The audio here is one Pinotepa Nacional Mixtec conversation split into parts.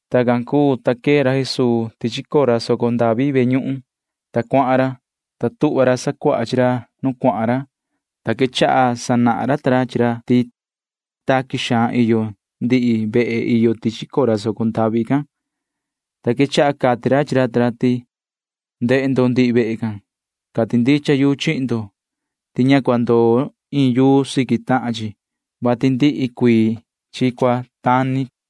Tacan cuu, ta quee ra Jesuu tichi cora soco ndavi ve ñuhun, ta cuahan ra, ta tuhva ra sacuaha chi ra nu cuahan ra, ta quechaha sanahan ra ta ra chi ra ti taqui xaan iyo ndihi vehe iyo tichi cora soco ndavi can, ta quechaha cati ra chi ra ta ra ti: ―Ndehe ndo ndihi vehe can. Cati ndicha yu chihin ndo ti ña cua ndoo iin yuu siqui tahan chi, vati ndihi cuii chi cua tani ―cati ra.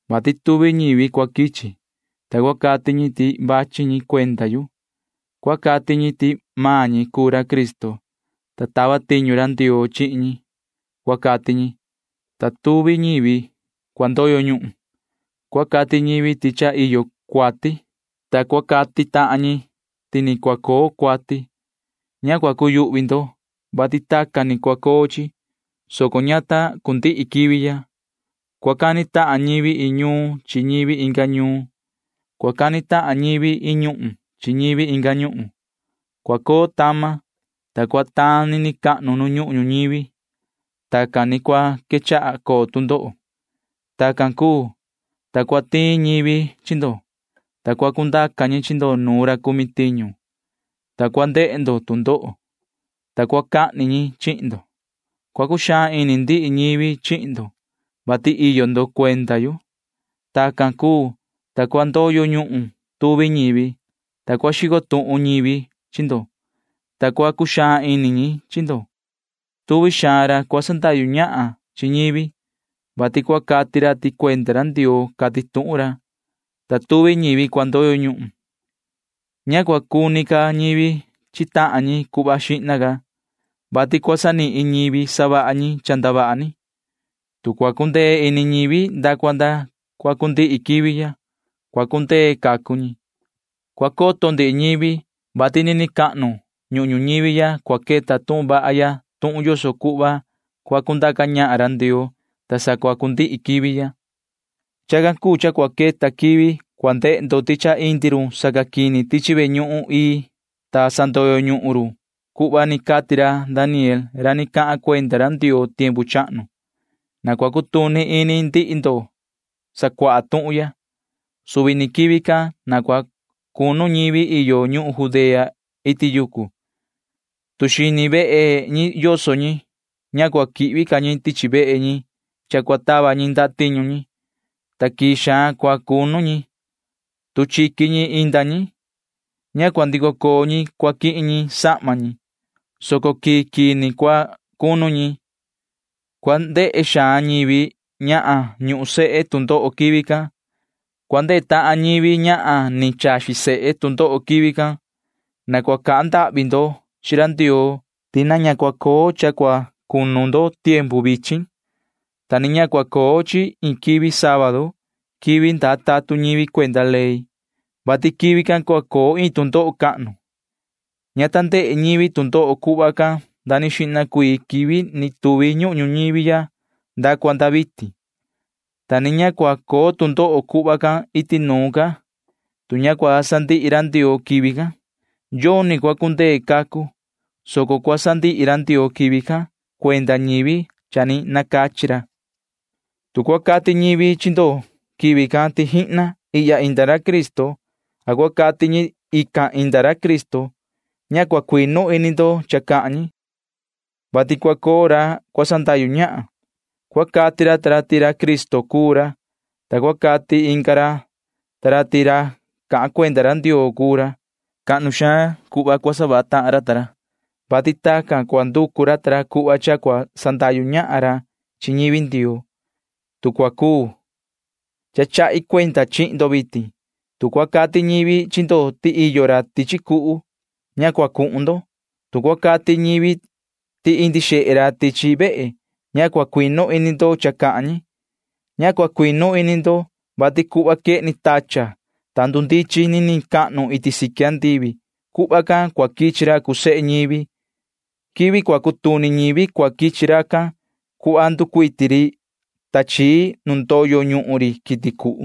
vati tuvi ñivi cua quichi, ta cua cati ñi ti quichi ñi cuenda yu. Cua cati ñi ti maan ñi cuu ra Cristo, ta tava tiñu ra Ndioo chihin ñi, cua cati ñi, ta tuvi ñivi cua ndoyo ñuhun. Cua cati ñivi ti cha iyo cuati, ta cua cati tahan ñi ti ni cua coo cuati. Ña cua cuyuhvi ndo, vati tacan ni cua coo chi, soco ña ta cundihi quivi ya. Cua cani tahan ñivi iin ñuun chi ñivi inga ñuun. Cua cani tahan ñivi iin ñuhun chi ñivi inga ñuhun. Cua coo tama, ta cua taan nini cahnu nu ñuhun ñuñivi. Tacan ni cua quechaha coo tu ndoho. ’Tacan cuu, ta cua tiin ñivi chi ndo, ta cua cundaca ñi chi ndo nuun ra cumi tiñu, ta cua ndehe ndo tu ndoho, ta cua cahni ñi chihin ndo. Cua cuxaan ini ndihi ñivi chihin ndo, vati iyo ndo cuenda yu. Tacan cuu, ta cua ndoyo ñuhun tuvi ñivi, ta cua xico tuhun ñivi chi ndo, ta cua cuxaan ini ñi chi ndo. Tuvi xaan ra cua sandahyu ñahan chi ñivi, vati cua cati ra ti cuenda ra Ndioo cati tuhun ra, ta tuvi ñivi cua ndoyo ñuhun. Ña cua cuni ca ñivi chi tahan ñi cuhva xihna ca, vati cua sanihin ñivi savaha ñi cha ndavaha ni. Tu cua cundee ini ñivi nda cua nda cua cundihi quivi ya, cua cundee cacu ñi. Cua coto ndihi ñivi, vati nini cahnu ñuhun ñuñivi ya cua queta tuhun vaha ya tuhun yoso cuhva cua cundaca ñahan ra Ndioo, ta sa cua cundihi quivi ya. ’Chacan cuu cha cua queta quivi cua ndehe ndo ti cha indi run sacaquini tichi ve ñuhun ii, ta sandoyo ñuhun run cuhva ni cati ra Daniel ra ni cahan cuenda ra Ndioo tiempu chahnu. Na cua cutuni ini ndihi ndo sacuaha tuhun ya. Suvi ni quivi can na cua cunu ñivi iyo ñuhun Judea iti yucu. Tu iyo ñi xini vehe, ña cua quihvi ca ñi tichi vehe ñi, vati cua tava ñi ndatiñu ñi, soco quii xaan cua cunu ñi. Tu inda ñi chiqui ñi, ña cua ndico coo ñi quihin ñi sahma ñi, soco quii quii ni cua cunu ñi. Tu ndoho cua ndehe ñivi ñahan ñuhun sehe quivi can. Tu ndoho cua ndehe tahan ñivi ñahan chaxi sehe quivi can. Na cua cahan ndahvi ndo chi ra Ndioo ti ña cua coo cha cua cunu ndo tiempu vichin, ta ni ña cua coo chi iin quivi sábadu [quivi ndaa tatun ñivi cuenda ley], vati quivi can cua coo iin tu ndoho cahnu. Ña ta ndehe ñivi tu ndoho cuhva can nda ni xihna cuii quivi ni tuvi ñuhun ñuñivi ya nda cua nda vitin, ta ni ña cua coo tu ndoho cuhva can iti nuun ca. Tu ña cua sandihi ra Ndioo quivi can, yoni cua cundee cacu, soco cua sandihi ra Ndioo quivi can cuenda ñivi cha ni nacachi ra. ’Tu cua cati ñivi chi ndo quivi can ti jihna ihya inda ra Cristo a cua cati ñi ti ican inda ra Cristo, ña cua cuinu ini ndo cha cahan ñi, vati cua coo ra cua sandahyu ñahan. Cua cati ra ta ra ti ra Cristo cuu ra, ta cua cati inga ra ta ra ti ra cahan cuenda ra Ndioo cuu ra. Cuhva cahnu xaan cua savaha tahan ra ta ra, vati tacan cua nducu ra ta ra cuhva cha cua sandahyu ñahan ra chi ñivi Ndioo, tu cua cuu. Cha chahi cuenda chihin ndo vitin. Tu cua cati ñivi chi ndo ti iyo ra tichi cuhu, ña cua cuhun ndo. Tu cua cati ñi ti indi xehe ra tichi vehe, ña cua cuinu ini ndo cha cahan ñi. Ña cua cuinu ini ndo, vati cuhva quehni tachan, ta ndundichin niniin iti siqui andivi―cuhva can cua quichi ra cuu sehe ñivi. [Quivi cua cutuni ñivi cua quichi racan,] cuhva nducuiti ri tachii nu ndoyo ñuhun ri quiti cuhu.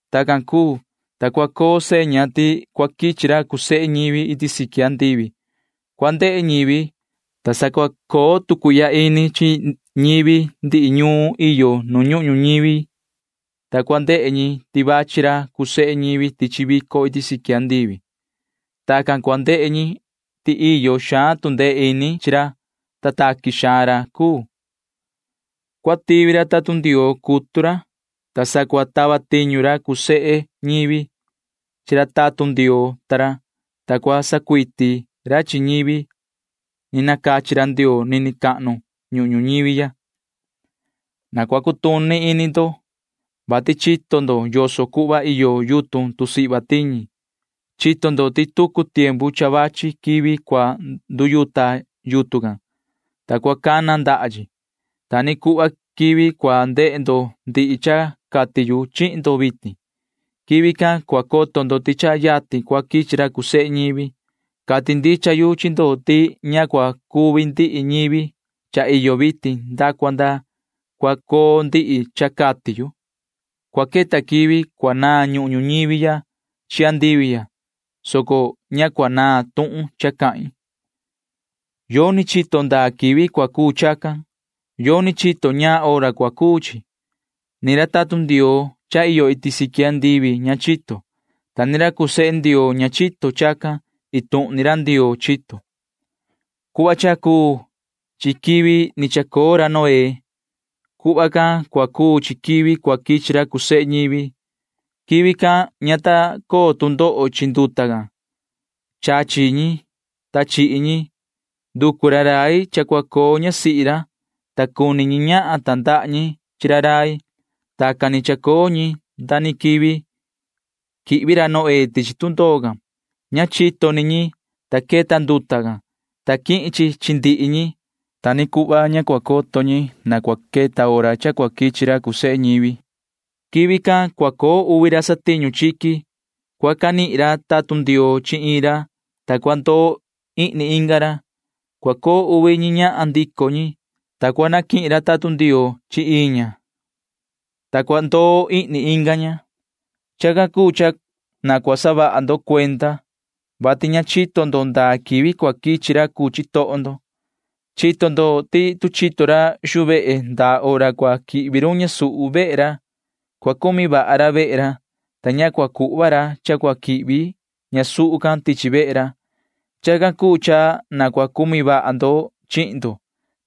Tacan cuu, ta cua coo seña ti cua quichi ra cuu sehe ñivi iti siqui andivi cua ndehe ñivi, ta sa cua coo tu cuihya ini chi ñivi ndihi ñuun iyo nu ñuhun ñuñivi, ta cua ndehe ñi ti vachi ra cuu sehe ñivi tichi vico iti siqui andivi. Tacan cua ndehe ñi ti iyo xaan tu ndee ini chi ra, ta taqui xaan ra cuu. Cua tivi ra tatun Ndioo cutu ra, ta sa cua tava tiñu ra cuu sehe ñivi can tatun Ndioo ta ra, ta cua sacuiti ra ta ra chi ñivi ni nacachi ra Ndioo nini cahnu ñuhun ñuñivi ya. ’Na cua cutuni ini ndo, vati chito ndo yoso cuhva iyo yutun tusihva tiñi. Chito ndo ti tucu tiempu cha vachi quivi cua nduyuta yutun can, ta cua cana ndaha chi. Ta ni cuhva quivi cua ndehe ndo ndihi cha cati yu chihin ndo vitin―quivi can cua coto ndo ti cha yatin cua quichi ra cuu sehe ñivi. Cati ndicha yu chi ndo ti ña cua cuvi ndihi ñivi cha iyo vitin nda cua nda cua coo ndihi cha cati yu. Cua queta quivi cua naan ñuhun ñuñivi ya chi andivi ya, soco ña cua naan tuhun cha cahin. ’Yoni chito ndaa quivi cua cuu chacan. Yoni chito ñaan hora cua cuu chi. Ña chito ra tatun Ndioo iyo iti siqui andivi, ta ni ña chito sehe ra Ndioo chacan. Iin tuhun ni ra Ndioo chito. ’Cuhva cha cuu chi quivi ni chacoo ra Noé―cuhva can cua cuu chi quivi cua quichi ra cuu sehe ñivi. Quivi can ña ta coo tu ndoho chi nduta can. Chachi ñi, ta chihi ñi. Nducu ra rai cha cua coo ñasihi ra, ta cuni ñi ñahan tandaha ñi chi ra rai. Tacan ni chacoo ñi nda ni quivi quihvi ra Noé can tichi tundoo can. Ña chito ñi cha ni queta hora can nda ni quichi nduta can, ta canihin run chi ndihi ñi. Ta ni cuhva ña cua coto ñi cha queta hora cha cua quichi ra cuu sehe ñivi. Quivi can cua coo uvi ra satiñu chiqui. Cua canihin ra tatun Ndioo chi iin ra, ta cua ndoo ihni inga ra. Cua coo uvi ñi ñahan ndico ñi, ta cua canihin ra tatun Ndioo chi iin ña, ta cua ndoo ihni inga ña. ’Chacan cuu cha na cua saha ndo cuenda, vati ña chito ndo ndaa quivi cua quichi ra cuu chitoho ndo. Chito ndo ti tu chito ra xuu vehe ndaa hora cua quichi run ñasuhu, cua cumi vaha ra vehe ra, ta ña cua cuhva ra cha cua quihvi ñasuhu can tichi vehe ra. Chacan cuu cha na cua cumi vaha ndo chihin ndo,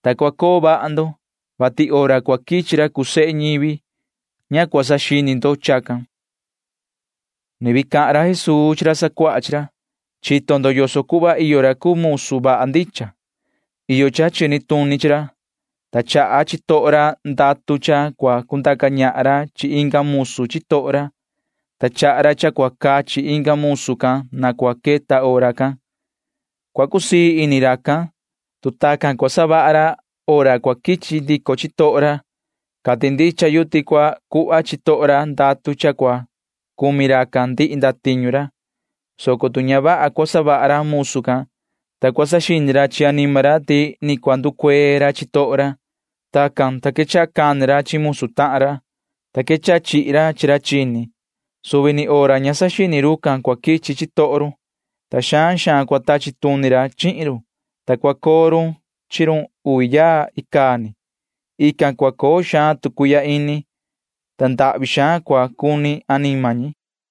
ta cua coo vaha ndo, vati hora cua quichi ra cuu sehe ñivi―ña cua saxini ndo chacan. [Ni vii cahan ra Jesuu chi ra sacuaha chi ra:] ’Chito ndo yoso cuhva iyo ra cuu musu vaha ndicha. Iyo cha chini tuni chi ra, ta chaha chitoho ra ndatu cha cua cundaca ñahan ra chi inga musu chitoho ra, ta chaha ra cha cua cachi inga musu can na cua queta hora can. Cua cusii ini racan, tu tacan cua savaha ra hora cua quichi ndico chitoho ra. Cati ndicha yu ti cua cuhva chitoho ra ndatu cha cua cumi racan ndihi ndatiñu ra, soco tu ña vaha cua savaha ra musu can, ta cua saxini ra chi anima ra ti ni cua nducuee ra chitoho ra, ta tacan, ta quechaha cani ra chi musu tahan ra, ta quechaha chihi ra chi ra chini. Suvi ni hora ña saxini rucan cua quichi chitoho run, ta xaan xaan cua tachi tuni ra chihin run, ta cua coo run chi run uvi yaa icaa ni. Ican cua coo xaan tu cuihya ini, ta ndahvi xaan cua cuni anima ñi.